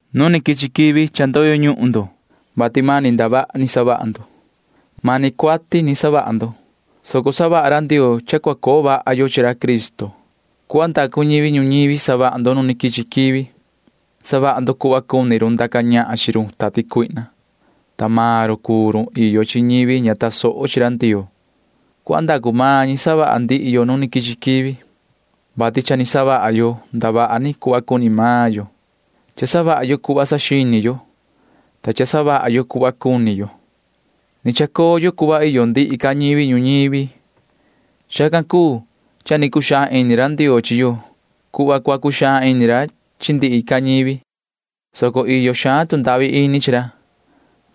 Nu ni quichi quivi cha ndoyo ñuhun ndo cuenda ra Ndioo, vati mani ndavaha ni savaha ndo. Mani cuati ni savaha ndo, soco savaha ra Ndioo cha cua coo vaha yo chi ra Cristo. Cuhva ndacu ñivi ñuñivi savaha ndo nu quichi quivi. Savaha ndo cuhva cuni run ndaca ñahan chi run tati cuihna, ta maan run cuu run iyo chi ñivi ña tasoho chi ra Ndioo. Cuhva ndacu maan ñi savaha ndihi yo nu quichi quivi, vati cha ni savaha yo ndavaha ni cuhva cuni maan yo. Cha savaha yo cuhva saxini yo, ta cha savaha yo cuhva cuni yo. Ni chacoo yo cuhva iyo ndihi ca ñivi ñuñivi. Chacan cuu cha cua cuxaan ini ra Ndioo chi yo cuhva cua cuxaan ini ra chi ndihi ca ñivi, soco iyo xaan tu ndahvi ini chi ra,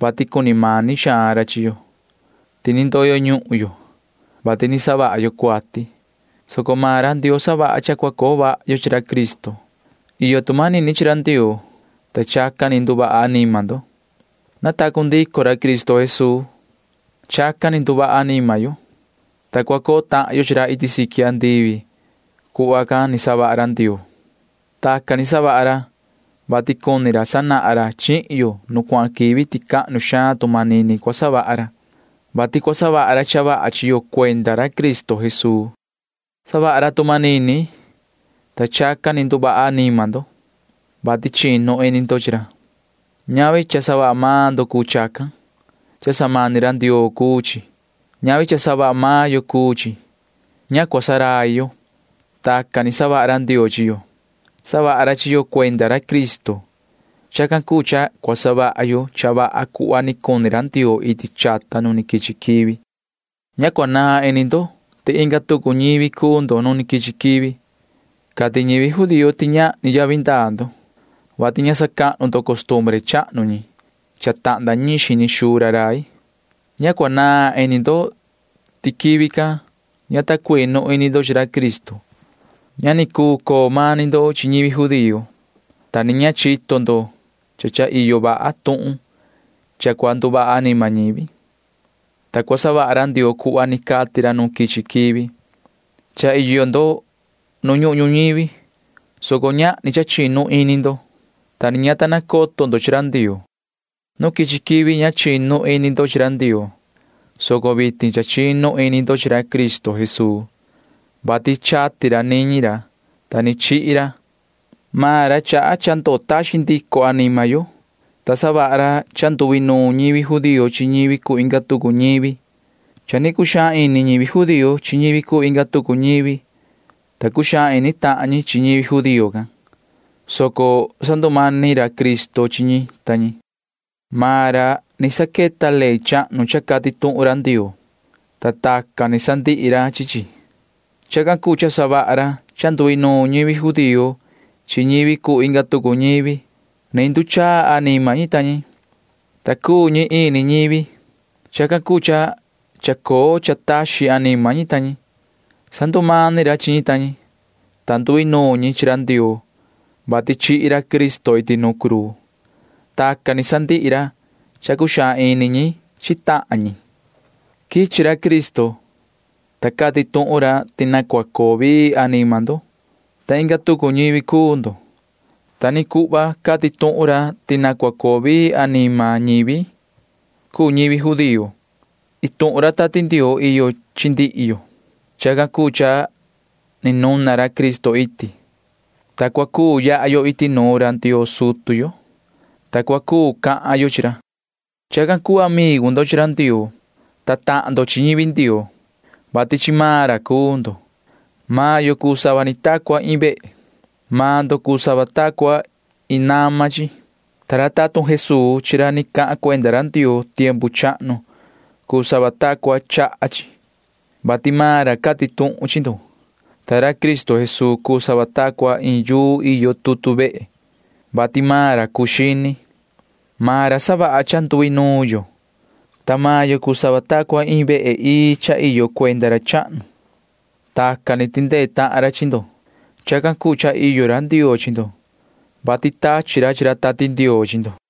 vati cuni mani xaan ra chi yo. Ndicha cha ni ndoyo ñuhun yo, vati ni savaha yo cuati, soco maan ra Ndioo savaha cha cua coo vaha yo chi ra Cristo. Iyo tu manini chi ra Ndioo, ta chacan ni nduvaha anima ndo. Natacu ndico ra Cristo Jesuu. Chacan ni nduvaha anima yo, ta cua coo tahan yo chi ra iti siqui andivi ni savaha ra Ndioo. Chacan ni savaha ra, vati cuni ra sanahan ra chihin yo nu cuahan quivi ti cahnu xaan tu manini cua savaha ra, vati cua savaha ra cha vaha chi yo cuenda ra Cristo Jesuu. Savaha ra tu manini, ta chacan ni nduvaha anima ndo, vati chinu ini ndo chi ra. Ñavi cha savaha maan ndo cuu chacan. Cha samani ra Ndioo cuu chi. Ñavi cha savaha maan yo cuu chi, coto cua ndurai yo. Chacan cuu cha ni savaha ra Ndioo chi yo. Savaha ra chi yo cuenda ra Cristo. Chacan cuu cha cua savaha yo cha vaha cuhva ni cuni ra Ndioo iti chata nu ni quichi quivi. Ña cua naan ini ndo ti inga tucu ñivi cuu ndo nu quichi quivi. Cati ñivi judío ti ñahni yavi ndaa ndo, vati ña sacahnu ndo costumbre chahnu ñi cha tahnda ñiin xini xuu ra rai. Ña cua naan ini ndo ti quivi can ña ta cuinu ini ndo chi ra Cristo. Ña ni cuu coo mani ndo chi ñivi judío, ta ni ña chito ndo ti cha iyo vaha tuhun cha cua nduvaha anima ñivi, ta cua savaha ra Ndioo cuhva ni cati ra nu quichi quivi. Cha iyo ndo nu ñuhun ñuñivi, soco ñahni cha chinu ini ndo, ta ni ña ta nacoto ndo chi ra Ndioo. Nu quichi quivi ña ta cuinu ini ndo chi ra Ndioo, soco vitin cha chinu ini ndo chi ra Cristo Jesuu, vati chati ra niñi ra, ta ni chihi ra. Maan ra chaha cha ndutaxin ndico anima yo, ta savaha ra cha nduinuun ñivi judío chi ñivi cuu inga tucu ñivi. Cha cuxaan ini ñivi judío chi ñivi cuu inga tucu ñivi, ta cuxaan ini tahan ñi chi ñivi judío can, soco sandumani ra Cristo chi ñi ta ñi. Maan ra ni saqueta ley chahnu cha cati tuhun ra Ndioo, ta tacan ni sandihi ra chi chi. Chacan cuu cha savaha ra cha nduinuun ñivi judío chi ñivi cuu inga tucu ñivi. Ni nduchaa anima ñi ta ñi, ta ini ñivi cuu ñi savaha ra. Chacan cuu cha sandutaxin ra anima ñi ta ñi. Sandumani ra chi ñi ta ñi, ta nduinuun ñi chi ra Ndioo, vati chihi ra Cristo iti nu cruu. Tacan ni sandihi ra cha cuxaan ini ñi chi tahan ñi. Quichi ra Cristo, ta cati tuhun ra ti na cua coo vii anima ndo, ta inga tucu ñivi cuu ndo. Ta ni cuhva cati tuhun ra ti na cua coo vii anima ñivi cuu ñivi judío. Ini ra Tati Ndioo iyo chi ndihi yo. Chacan cuu cha ni nuna ra Cristo iti, ta cua cuu yaha yo iti nuun ra Ndioo sutu yo, ta cua cuu cahan yo chi ra. Chacan cuu cha cuu amigu ndo chi ra Ndioo, ta tahan ndo chi ñivi Ndioo, vati chi maan ra cuu ndo. Maan yo cuu sava ta cua iin vehe. Maan ndo cuu sava ta cua iin nama chi, ta ra tatun Jesuu chi ra ni cahan cuenda ra Ndioo tiempu chahnu cuu sava ta cua chaha chi, [vati maan ra cati tuhun chi ndo]. Ta ra Cristo Jesuu cuu sava ta cua iin yuu iyo tutu vehe, vati maan ra cuu xini. Maan ra savaha cha nduinuun yo, ta maan yo cuu sava ta cua iin vehe ii cha iyo cuenda ra chahnu. Tacan ni tindee tahan ra chi ndo. Chacan cuu cha iyo ra Ndioo chi ndo, vati tachi ra chi ra Tati Ndioo chi ndo.